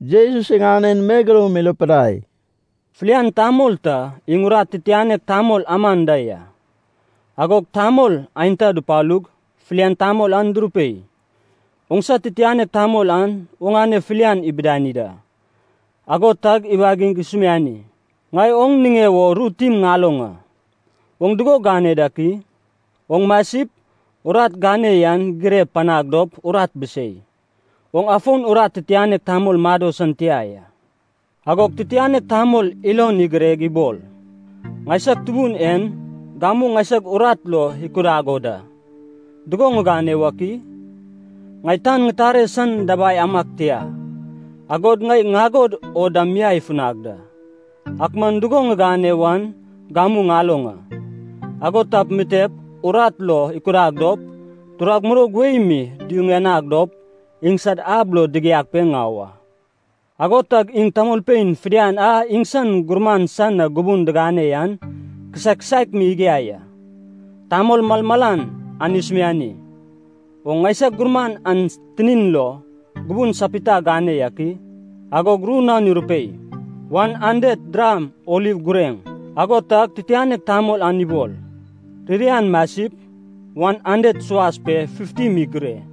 Jesus iŋanen megeloum irupidai, “Filian tamol ta iŋ urat titianek tamol aman da ya. Agog tamol aenta dupalug, filian tamol an durupei, ‘Oŋsa titianek tamol an oŋane filia ibidani da.’ Ago tag iwagig isumiani, ‘Ŋai oŋ niŋe wo ru tim ŋaloŋ a. Oŋ dugo gane dak i? Oŋ masip, urat gane yan girep panag dop urat bisei. Oŋ afon urat titianek tamol mado san tia ya.’ “Agog titianek tamol ilon igireg ibol, ‘Ŋaisag tubun en gamu ŋaisag urat lo ikudag o da. Dugo ŋigane wak i? Ŋai tan ŋitare san dabai amag tia. Agod ŋai ŋagod o dam miai ifunag da. Ak man dugo ŋigane wan gamu ŋaloŋ a. Ago tap mitep urat lo ikudag dop, turag muroug wei mi duyuŋanag dop iŋsad ab lo digiag pe ŋau a.’ “Ago tag iŋ tamolpein fidian a iŋsan gurman san na gubun digane yan kisaek kisaek mi igiai a. Tamol malmalan an isumiani, ‘Oŋ ŋaisag gurman an tinin lo gubun sapita gane yak i?’ “Agog ru naon irupei, ‘Wan handet dram oliv gureŋ.’ “Ago tag titianek tamol an ibol, ‘Ririan masip, wan handet suas pe fifti mi gire.’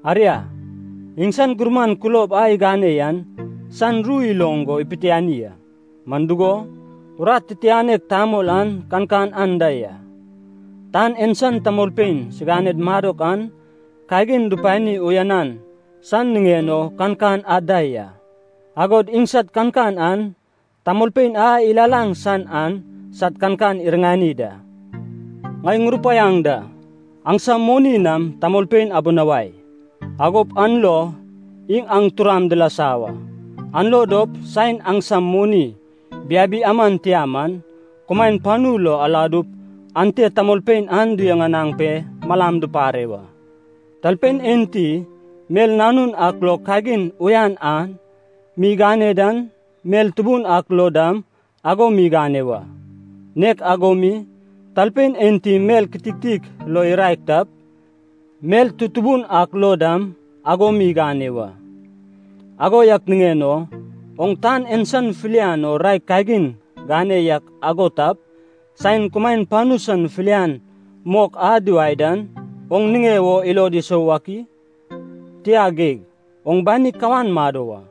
“Aria, iŋsan gurman kulob a igane yan san ru iloŋ go ipitiani a, man dugo, urat titianek tamol an kankan anda ya. Tan en san tamolpein siganed madok an kagin dupani uyanan san niŋen o kankan ad da ya, agod iŋsad kankan an, tamolpein a ilalaŋ san an sad kankan iriŋani da. Ŋai ŋurupaiaŋ da. Aŋsam moni nam tamolpein abinawai. Agop an lo iŋ aŋ turam dilasa wa. An lo dop saen aŋsam moni biabi aman tia man, kumaen panu lo aladup ante tamolpein an duyuŋanaŋ pe malam dupare wa. “Talpein enti mel nanun ak lo kagin uyan an mi igane dan, mel tubun ak lo dam ago mi igane wa. Nek ago mi, talpein enti mel kititik lo iraek tap, mel tutubun ak lo dam ago mi igane wa. Ago yak niŋen o, oŋ tan en san filian o raek kagin gane yak ago tap, saen kumaen panu san filian mok a diwae dan, oŋ niŋe wo ilod isou wak i? Tia geig, oŋ bani kawan mado wa.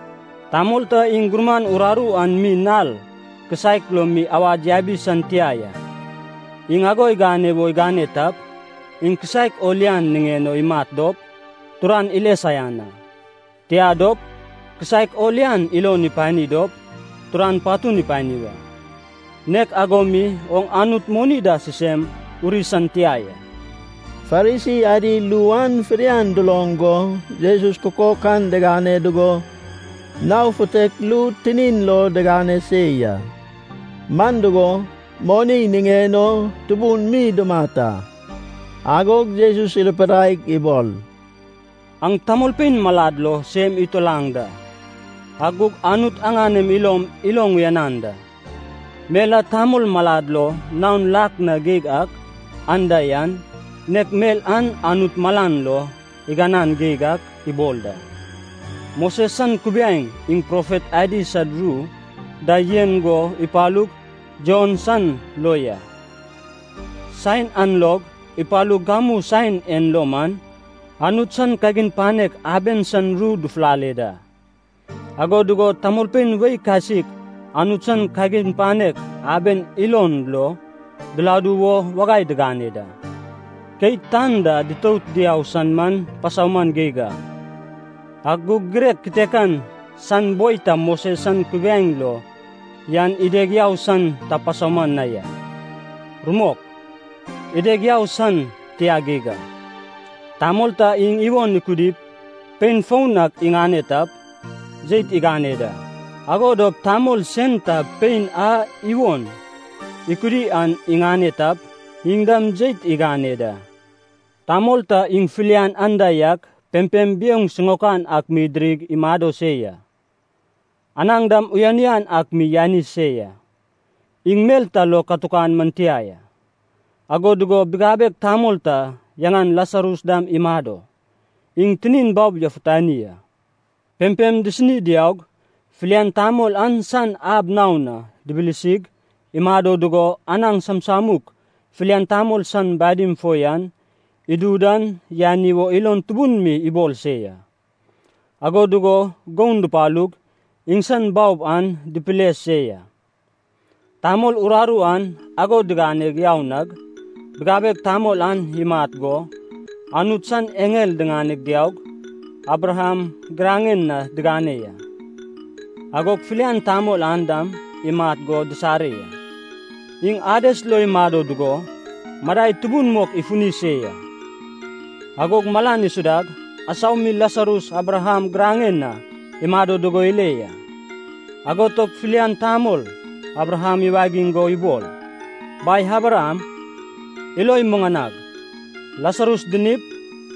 “Tamol ta iŋ gurman uraru an mi nal kisaek lo mi awad yabi san tia ya. Iŋ ago igane wo igane tap, iŋ kisaek o lian niŋen o imat dop, turan ile saian a. Tia dop, kisaek o lian ilon ipani dop, turan patun ipani wa. Nek ago mi oŋ Anut moni da sisem uri san tia ya.” Farisi adi ru an fidian duloŋ go Jesus kukok an digane dugo nao futek ru tinin lo digane se ya. Man dugo, moni niŋen o tubun mi dumat a. Agog Jesus irupidaig ibol, “Aŋ tamolpein malad lo sem itulaŋ da, ak gug Anut aŋanem ilom iloŋ uyanan da. Mel a tamol malad lo naon lak na geig ak anda yan, nek mel an Anut malan lo iganan geig ak ibol da.” “Moses san kubiaeŋ iŋ profet adi sad ru da yen go ipalug Jon san lo ya. Saen an log ipalug gamu saen en lo man, Anut san kagin panek aben san ru dufulale da. Ago dugo tamolpein wei kasik Anut san kagin panek aben ilon lo diladu wo wagai digane da. Keit tan da ditout diau san man pasauman geig a, ak gug girek kitekan san boi ta Moses san kubiaeŋ lo yan ideg yau san ta pasauman na ya. Rumok, ideg yau san tia geig a. “Tamol ta iŋ iwon ikudip pein foun ak iŋane tap, jeit igane da. Ago dop tamol sen ta pein a iwon ikudi an iŋane tap, iŋ dam jeit igane da. “Tamol ta iŋ filian anda yak pempem biouŋ sisiŋaok ak mi idirip imado se ya. Anaŋ dam uyan uyan ak mi yani se ya Iŋ mel ta lo katukan man tia ya. Ago dugo bigabeg tamol ta yaŋan Lasarus dam imado. Iŋ tinin baob yafutani a. Pempem disini diaug, filian tamol an san ab naon na dibilisig, imado dugo anaŋ samsamuk filian tamol san badim fo yan idu dan yani wo ilon tubun mi ibol se ya. Ago dugo goun dupalug, iŋsan baob an dipile se ya. “Tamol uraru an ago digane yau nag, bigabeg tamol an imat go, Anut san eŋel diŋaneg diaug, Abraham giraŋen na digane ya. Agog filian tamol an dam imat go disare ya. Iŋ Ades lo imado dugo, madai tubun mok ifuni se ya. Agog malan isudag, asau mi Lasarus Abraham giraŋen na imado dugo ile ya. Ago tag filian tamol Abraham iwagig go ibol, ‘Bai Abraham, ilo imuŋanag. Lasarus dinip,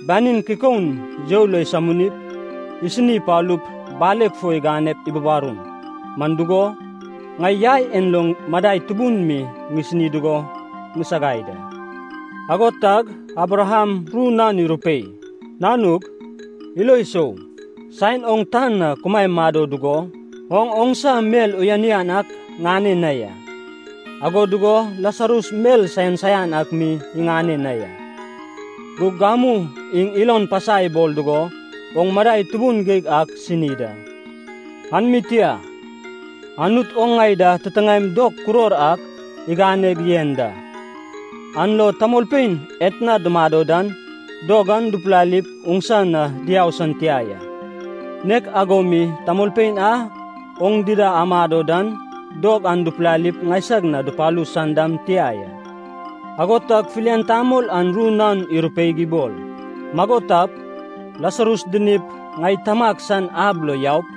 banin kikoun you lo isaminip, isini ipalup baleg fo iganep ibubarum. Man dugo, ŋai yai en lo madai tubun mi ŋisini dugo ŋisagai da.’ “Ago tag Abraham ru naon irupei, ‘Nanug, ilo isou. Saen oŋ tan na kumae mado dugo, oŋ oŋsa mel uyan uyan ak ŋane na ya, ago dugo Lasarus mel saian saian ak mi iŋane na ya. Gug gamu iŋ ilon pasa ibol dugo oŋ madai tubun geig ak sini da. An mi tia, Anut oŋ ŋai da titiŋaem dog kuror ak iganeg yen da. An lo tamolpein etna dumado dan dog an dupilalip oŋsa na diau san tia ya, nek ago mi tamolpein a oŋ dida amado dan dog an dupilalip ŋaisag na dupalu san dam tia ya.’ “Ago tag filian tamol an ru naon irupeig ibol, ‘Mago tap, Lasarus dinip, ŋai tamag san ab lo yaup,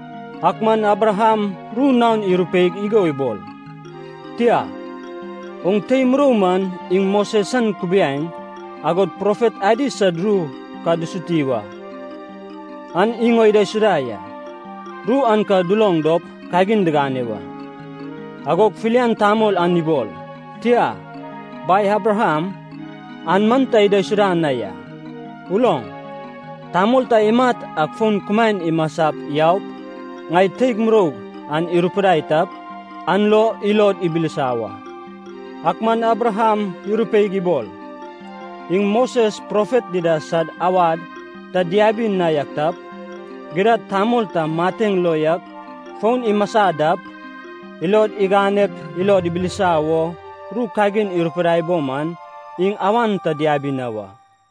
“Ak man Abraham ru naon irupeig igo ibol, ‘Tia. Oŋ tei murou man iŋ Moses san kubiaeŋ, agod profet adi sad ru ka dusuti wa, an iŋ o idaisuda ya. Ru an ka duloŋ dop kagin digane wa.’ “Agog filian tamol an ibol, ‘Tia. Bai Abraham, an man ta idaisuda na ya. Uloŋ, tamol ta imat ak fon kumaen imasap yaup, ŋai teig muroug an irupidai tap, an lo ilod ibilisa wa.’ “Ak man Abraham irupeig ibol, ‘Iŋ Moses profet dida sad awad ta diabi na yak tap, gidad tamol ta mateŋ lo yak fon imasa dap, ilod iŋanep ilod ibilisa wo ru kagin irupidai bo man, iŋ awan ta diabi na wa.’”